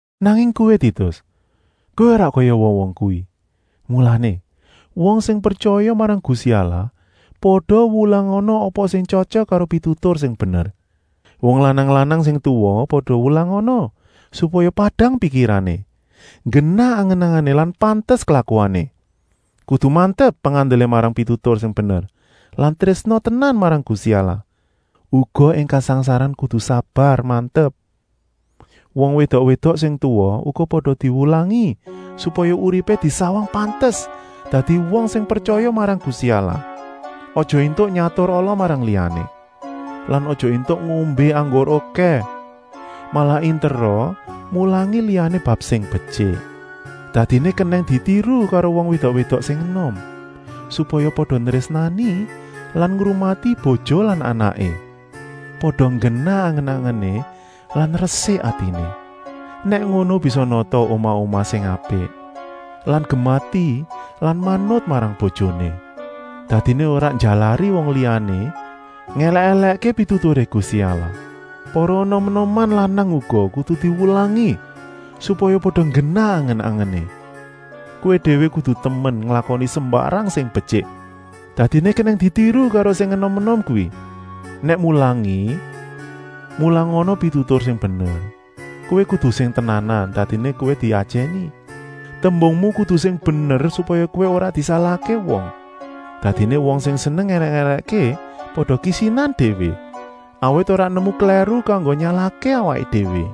Nanging kowé Titus, kowé ora kaya wong-wong kuwi. Mulané, wong sing pretyaya marang Gusti Allah pada wulangana apa sing tyotyok karo pitutur sing bener. Wong lanang-lanang sing tuwa pada wulangana supaya padang pikirané, nggenah angen-angené lan pantes klakuané. Kudu mantep pengandelé marang pitutur sing bener lan trésna tenan marang Gusti Allah. Uga ing kasangsaran kudu sabar-mantep. Wong wédok-wédok sing tuwa uga pada diwulangi supaya uripé disawang pantes dadi wong sing pretyaya marang Gusti Allah. Aja éntuk nyatur ala marang liyané lan aja éntuk ngombé anggur okèh, malah intera mulangi liyané bab sing betyik. Dadiné kenèng ditiru karo wong wédok-wédok sing enom, supaya pada nrésnani lan ngrumati bojo lan anaké, pada nggenah angen-angené lan resik atiné. Nèk ngono bisa nata omah-omah sing apik lan gemati lan manut marang bojoné. Dadiné ora njalari wong liyané ngèlèk-èlèkké pituturé Gusti Allah. Para enom-enoman lanang uga kudu diwulangi supaya pada nggenah angen-angené. Kowé déwé kudu temen nglakoni sembarang sing betyik, dadiné kenèng ditiru karo sing enom-enom kuwi. Nèk mulangi, mulangana pitutur sing bener. Kowé kudu sing tenanan, dadiné kowé diajèni. Tembungmu kudu sing bener supaya kowé ora disalahké wong. Dadiné wong sing seneng ngèlèk-èlèkké pada kisinan déwé, awit ora nemu klèru kanggo nyalahké awaké déwé.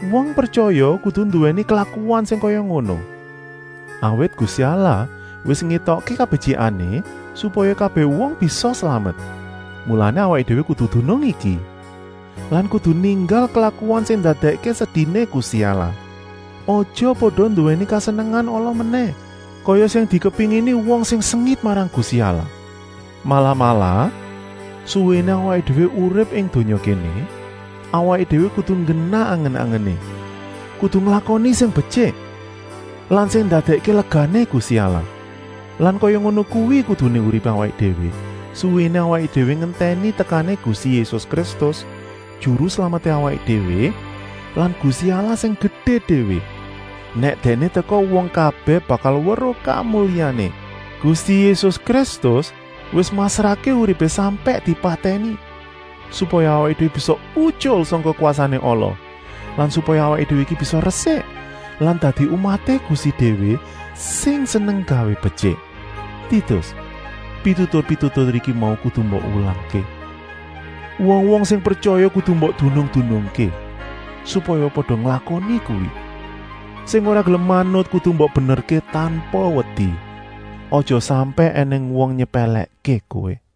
Wong pretyaya kudu nduwèni klakuan sing kaya ngono, awit Gusti Allah wis ngétokké kabetyikané supaya kabèh wong bisa slamet. Mulané awaké déwé kudu dunung iki lan kudu ninggal klakuan sing ndadèkké sediné Gusti Allah. Aja pada nduwèni kesenengan ala menèh kaya sing dikepéngini wong sing sengit marang Gusti Allah. Malah-malah, suwéné awaké déwé urip ing donya kéné, awaké déwé kudu nggenah angen-angené, kudu nglakoni sing betyik lan sing ndadèkké legané Gusti Allah. Ya kaya ngono kuwi kuduné uripé awaké déwé suwéné awaké déwé ngentèni tekané Gusti Yésus Kristus, Juru Slameté awaké déwé lan Gusti Allah sing gedé déwé. Nèk Dèkné teka wong kabèh bakal weruh kamulyané. Gusti Yésus Kristus wis masrahké uripé sampèk dipatèni, supaya awaké déwé bisa utyul sangka kwasané ala lan supaya awaké déwé iki bisa resik lan dadi umaté Gusti déwé, sing seneng nggawé betyik. Titus, pitutur-pitutur iku mau kudu mbok wulangké. Wong-wong sing pretyaya kudu mbok dunung-dunungké, supaya pada nglakoni kuwi. Sing ora gelem manut kudu mbok benerké tanpa wedi. Aja sampèk ènèng wong nyepèlèkké kowé.